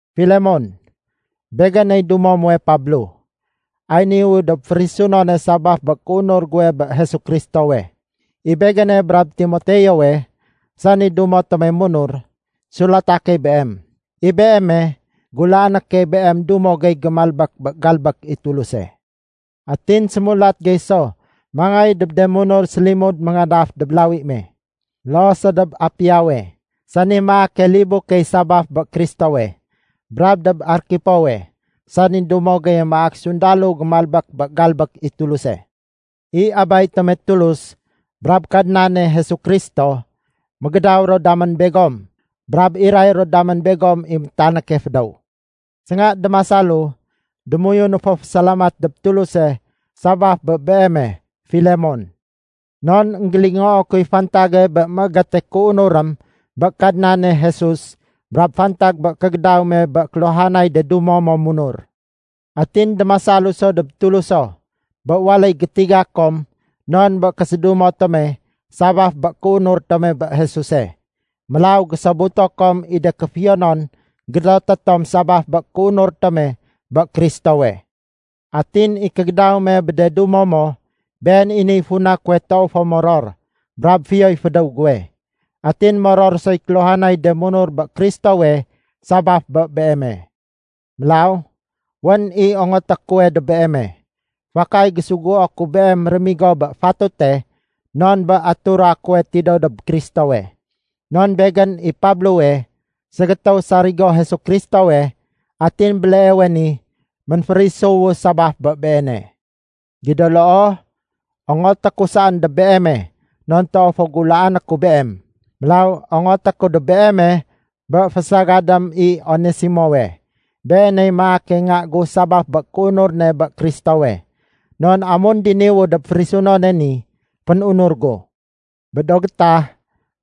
Filemon, Begéney dumo muwe Pablo. Ay niwu dob férisunone sabaf bé kéunur guwe bé Jesu Kristowe. I begéne brab Timoteowe, sani dumo tome munur, sulata key beem. I beeme, gulaané key beem dumo gey gémalbék bé galbék i Tuluse. Atin sémulat gey so mangéy dob de munur sélimud méngadaf dob lawi me. Loo so dob Apiawe, sani maake libu key sabaf bé Kristowe, brab dob Arkipowe sani dumo geye maak sundalo gémalbék bé galbék i Tuluse. I Abay tome Tulus brab Kadnane Jesu Kristo, mégédaw ro damén begom brab iray ro damén begom i métanéke fédéw. Sénga démasalu, démoyunu fo fésalamat dob Tuluse sabaf bé beeme, Filemon. Non énggélingoo kuy fantage bé mégéte kéunurém bé Kadnane Jesus brab fantag bé kégédaw me bé kéluhanay de dumo mo munur. Atin démasalu so dob Tuluso bé waléy gétiga kom non bé késédumo tome sabaf bé kéunur tome bé Jesuse. Mélaw gésobuto kom i de kéfiyonon gédoté tom sabaf bé kéunur tome bé Kristowe. Atin i kégédaw me bé de dumo mo, been i niy funa kuwe toow fo moror brab fiyoy fédéw guwe. Atin moror soy kéluhanay de munur bé Kristowe sabaf bé beeme. Mélaw, wén i ongoté kuwe dob beeme. Fakay gésuguo ku beem rémigo bé fatute non bé atura kuwe tidéw dob Kristowe. Non begén i Pablowe, ségétéw sarigo Jesu Kristowe, atin béleewe ni ménférisuwu sabaf bé Beene. Gido loo, ongoté ku saén dob beeme non toow fo gulaané ku beem. Mélaw, ongoté ku dob beeme bé fésagadém i Onesimowe. Beeney maake nga gu sabaf bé kéunur ne bé Kristowe. Non amun diniwu dob férisunone ni, fénunur gu. Bé do gétah,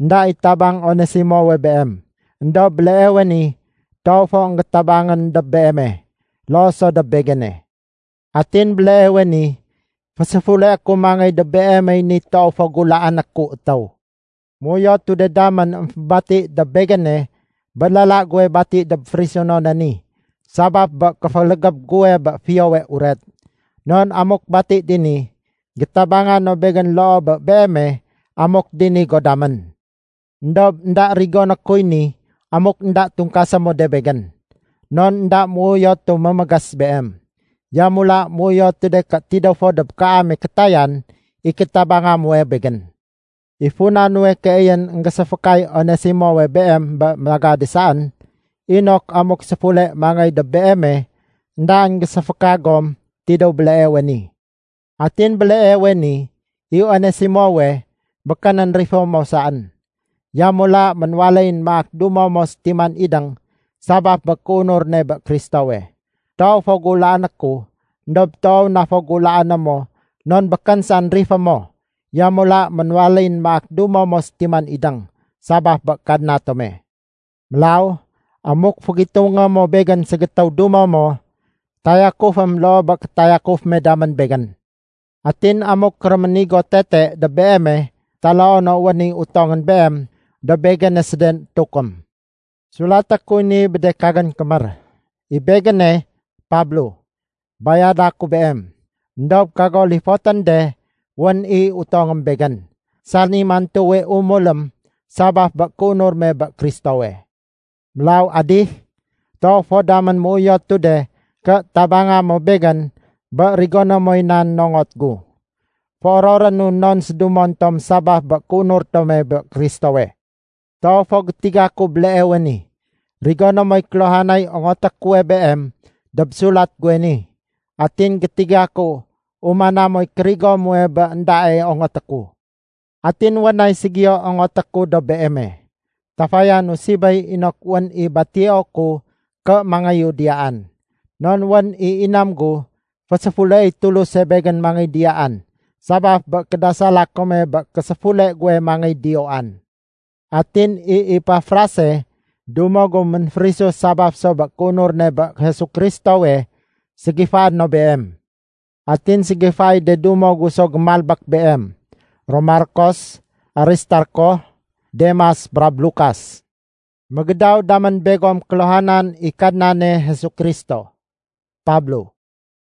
énda i tabang Onesimowe beem. Endob béleewe ni toow fo énggétabangén dob beeme, loo so dob begéne. Atin béleewe ni féséfuleé ku mangéy dob beemey ni toow fo gulaané ku étéw. Méuyotu de damén émfébati dob begéne bé lala guwe bati dob férisunone ni sabaf bé kéfélégéb guwe bé Fiyowe Uret. Non amuk bati dini, gétabanga no begén loo bé beeme amuk dini go damén. Endob énda rigoné kuy ni amuk énda tungkasé mo de begén. Non énda méuyotu mémégés beem. Yamula méuyotu de ké tidéw fo dob kaame kétayan i kétabanga muwe begén. I funa nuwe keyén énggéséfékay Onesimowe beem bé magade saén, inok amuk séfule mangéy dob beeme, éndaén géséféka gom tidéw béleewe ni. Atin béleewe ni, i Onesimowe, békénén rifé mo saén. Yamula ménwaléyén maak dumo mo sétiman idéng sabaf bé kéunur ne bé Kristowe. Toow fo gulaané ku éndob toow na fo gulaané mo non békén saén rifé mo, yamula ménwaléyén maak dumo mo sétiman idéng sabaf bé Kadna tome. Mélaw amuk fégitungé mo begén ségétéw dumo mo, tayakufém loo bé kétayakuf me damén begén. Atin amuk réménigo tete dob beeme taloo no wén i utongén beem, dob begéne séden étukém. Sulaté kuy ni bé de kagén kémér: I begéne, Pablo, bayada ku beem. (Endob kago lifotén de wén i utongém begén, sani mantuwe umulém sabaf bé kéunur me bé Kristowe.) Mélaw adih, toow fo damén méuyotu de ké tabanga mo begén bé rigoné moy nan nongot gu. Féororénu non sédumon tom sabaf bé kéunur tome bé Kristowe. Toow fo gétiga ku béleewe ni, rigoné moy kéluhanay ongoté kuwe beem dob sulat guwe ni, atin gétiga ku umana moy kérigo muwe bé éndae ongoté ku. Atin wén nay ségiyo ongoté ku dob beeme. Tafayanu sibéy inok wén i batio ku ké mangéyu diyaan. Non wén i inam gu féséfuleéy Tuluse begén mangéy diyaan sabaf bé kédasala kome bé késéfule guwe mangéy diyoan. Atin i Epafrase dumo gu ménférisu sabaf so bé kéunur ne bé Jesu Kristowe, ségifaé no beem. Atin ségifaéy de dumo gu so gémalbék beem, ro Markos, Aristarko, Demas brab Lukas. Mégédaw damén begom kéluhanan i Kadnane Jesu Kristo. Pablo